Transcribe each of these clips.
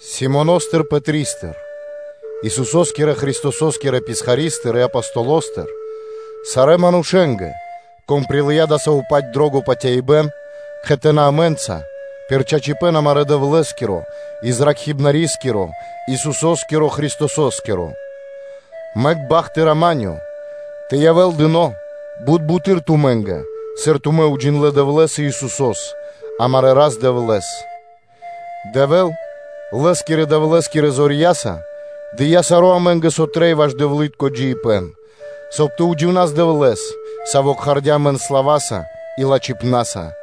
Симоностыр Пэтристыр, Исусо́скирэ Христосо́скирэ писхаристыр и Апостолостыр, сарэ́ манушэ́нгэ, кон прилыя́ дасаво-паць дро́го патяибэ́н кхэтанэ́ амэ́нца пир чачипэ́н амарэ́ Дэвлэ́скиро и Зракхибнарискиро, Исусо́скирэ Христосо́скиро, мэк бахт и рама́нё (миро) тэ явэ́л дыно́ бут буты́р тумэ́нгэ, сыр тумэ́ уджиндлэ́ Дэвлэ́с и Исусо́с, амарэ́ Рас-Дэвлэ́с, Дэвэ́л, Лэ́скирэ Дэвлэ́скирэ зорья́са дыя́ саро́ амэ́нгэ, со трэй ваш дэвлы́тко джиибэ́н, соб (кай) тэ уджинас Дэвлэ́с, Саво́ кхардя́ амэн кэ Пэ слава́са и лачхипна́са,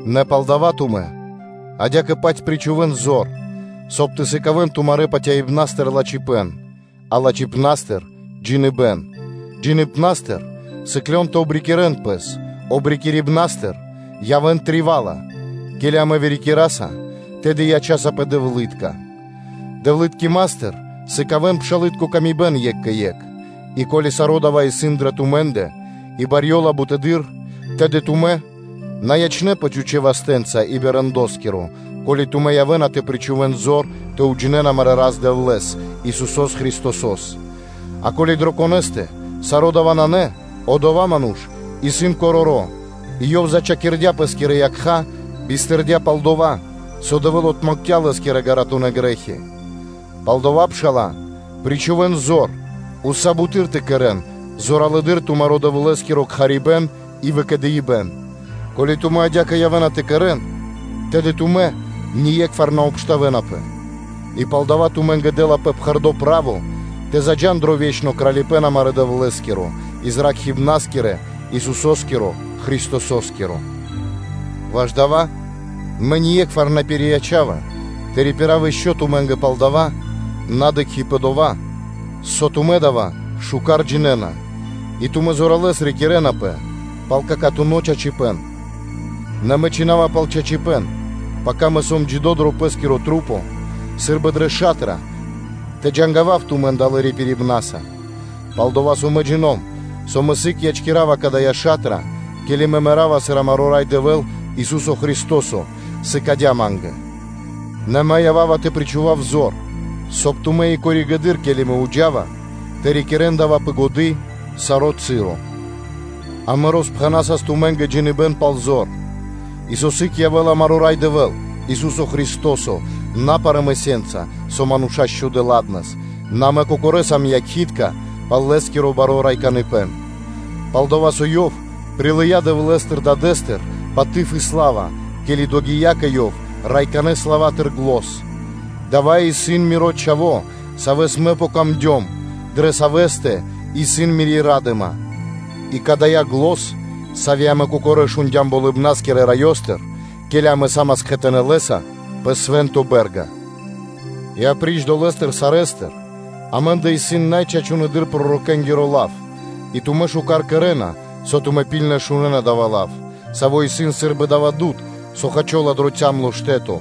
Нэ палдава́ тумэ́ адя́кэ-паць причхувэ́н зор, соб (кай) тэ сыкавэ́н тумарэ́ патяибнастыр лачхипэ́н, а лачхипнастыр джиныбэ́н, джиныбнастыр сыклён тэ обрикирэн пэс, обрикирибнастыр явэ́н вырикирдэ (тривала), ке́ли амэ вырикираса, тэды ячасапэ дэвлытконэнца, дэвлыткиматыр сыкавэ́н пшалы́тко паты́в екх екхэ́скэ: и ко́ли саро́ дава́ исын дрэ тумэ́ндэ и барьёла бутэды́р, тэды тумэ́ на ячэ́нпэ чхучэ́ вастэ́нца и би рэндоскиро, ко́ли тумэ́ явэ́на тэ причхувэ́н зор тэ уджинэ́н амарэ́ Рас – Дэвлэ́с, Исусо́с Христосо́с; а ко́ли дрэ конэ́стэ саро́ дава́ нанэ, одова́ ману́ш исын короро́ и ёв зачхакирдя пэ́скирэ якха́, бистырдя пал дова́, со Дэвэ́л отмэкця́ лэ́скирэ ґаратунэ́ грэ́хи. Палдава́, пшала́лэ, причхувэ́н зор уса́ буты́р тэ кэрэ́н зоралэды́р тумаро́ Дэвлэ́скиро кхарибэн и выкэдыибэн; ко́ли тумэ́ адя́кэ явэ́на тэ кэрэ́н, тэды тумэ́ ние́кхвар на обштавэнапэ; и палдава́ тумэ́нгэ дэ́лапэ пхэрдо́ право тэ заджа́н дро ве́чно кралипэ́н амарэ́ Дэвлэ́скирэ и Зракхибнарискирэ, Исусо́скиро Христосо́скиро. Ваш дава́ мэ ние́кхвар на пириячава тэ рипирав ишчо (инкэ́) тумэ́нгэ пал дава́, на дыкхи́ пэ дова́, со дава́ тумэ́ миштэ́с джинэ́н, и тумэ́ зоралэ́с рикирэнапэ пал чачипэ́н акана́. Нэ мэ чхина́ва пал чачипэ́н, пака мэ сом джидо́ сы́рбы дрэ ша́тра тэ джангавав тумэн далэ́ рипирибнаса, пал-дова́ со мэ джино́м (джина́в), со мэ сыг/сы́гэс ячкирава дая́ ша́тра, ке́ли мэ мэра́ва сыр амаро́ Рай Дэвэ́л, Ису́со Христо́со сыкадя́ ма́нгэ; нэ мэ ява́ва тэ причхував зор, соб (кай) тумэ́ и коригэды́р (позжэ), ке́ли мэ джа́ва тумэ́ндыр, тэ рикирэ́н дава́ пэ годы́ саро́ часо. Амэ роспхэнасас тумэ́нгэ джиныбэ́н пал зор, и со сыг явэ́ла амаро́ Рай Дэвэ́л, Ису́со Христо́со на парамысенца, со мануша́ счхудэ годэс, нэ амэ кокорэ́ сам якхи́тка пал Лэ́скиро баро́ райканыпэн. Пал-дова́ со Ёв прилыя́ Дэвлэ́стыр Дадэ́стыр паты́в и сла́ва, ке́ли догия́ кэ Ёв райканэ славатыр зан: “Дава́ исын Миро Чхаво́, Саво́ Ма́нгэ яця́ Дро́го, дрэ Савэ́стэ исын Мири́ ра́дыма”, и кадая́ зан, сави́ амэ кокорэ́ шундя́м Болыбна́скирэ Раёстыр, ке́ли амэ са́мас кхэтанэ́ Лэ́са пэ свэ́нто бэ́рга. И апри́ч дова́, саро́ амэ́ндэ исын най чачунэдыр пророкэнгиро лав, и тумэ́ миштэ́с кэрэ́на, со тумэ́ ракхибны́ткэс шунэ́на дава́ лав, саво́ исын сы́рбы дава́ дуд (свэ́то), со хачола дро цямло штэ́то,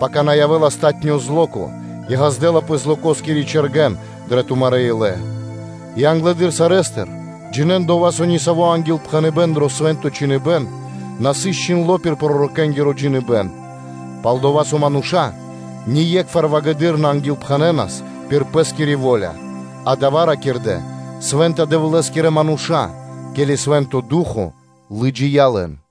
пака на явэ́ла палатуно́ зло́ко (ра́нко) и ґаздэ́лапэ злокоскири чэргэн дрэ тумарэ́ илэ, и англэды́р сарэ́стыр джинэ́н дова́, со нисаво́ ангилпхэныбэ́н дро Свэ́нто Чхиныбэ́н на сыс чхиндло́ пир пророкэнгиро джиныбэ́н, пал-дова́ со мануша́ ние́кхвар вагэдыр (ґарэдыр) на ангилпхэнэнас пир пэ́скири во́ля, а дава́ ракирдэ́ свэ́нта Дэвлэ́скирэ мануша́, ке́ли Свэ́нто Ду́хо (Фа́но) лыджия́ лэн.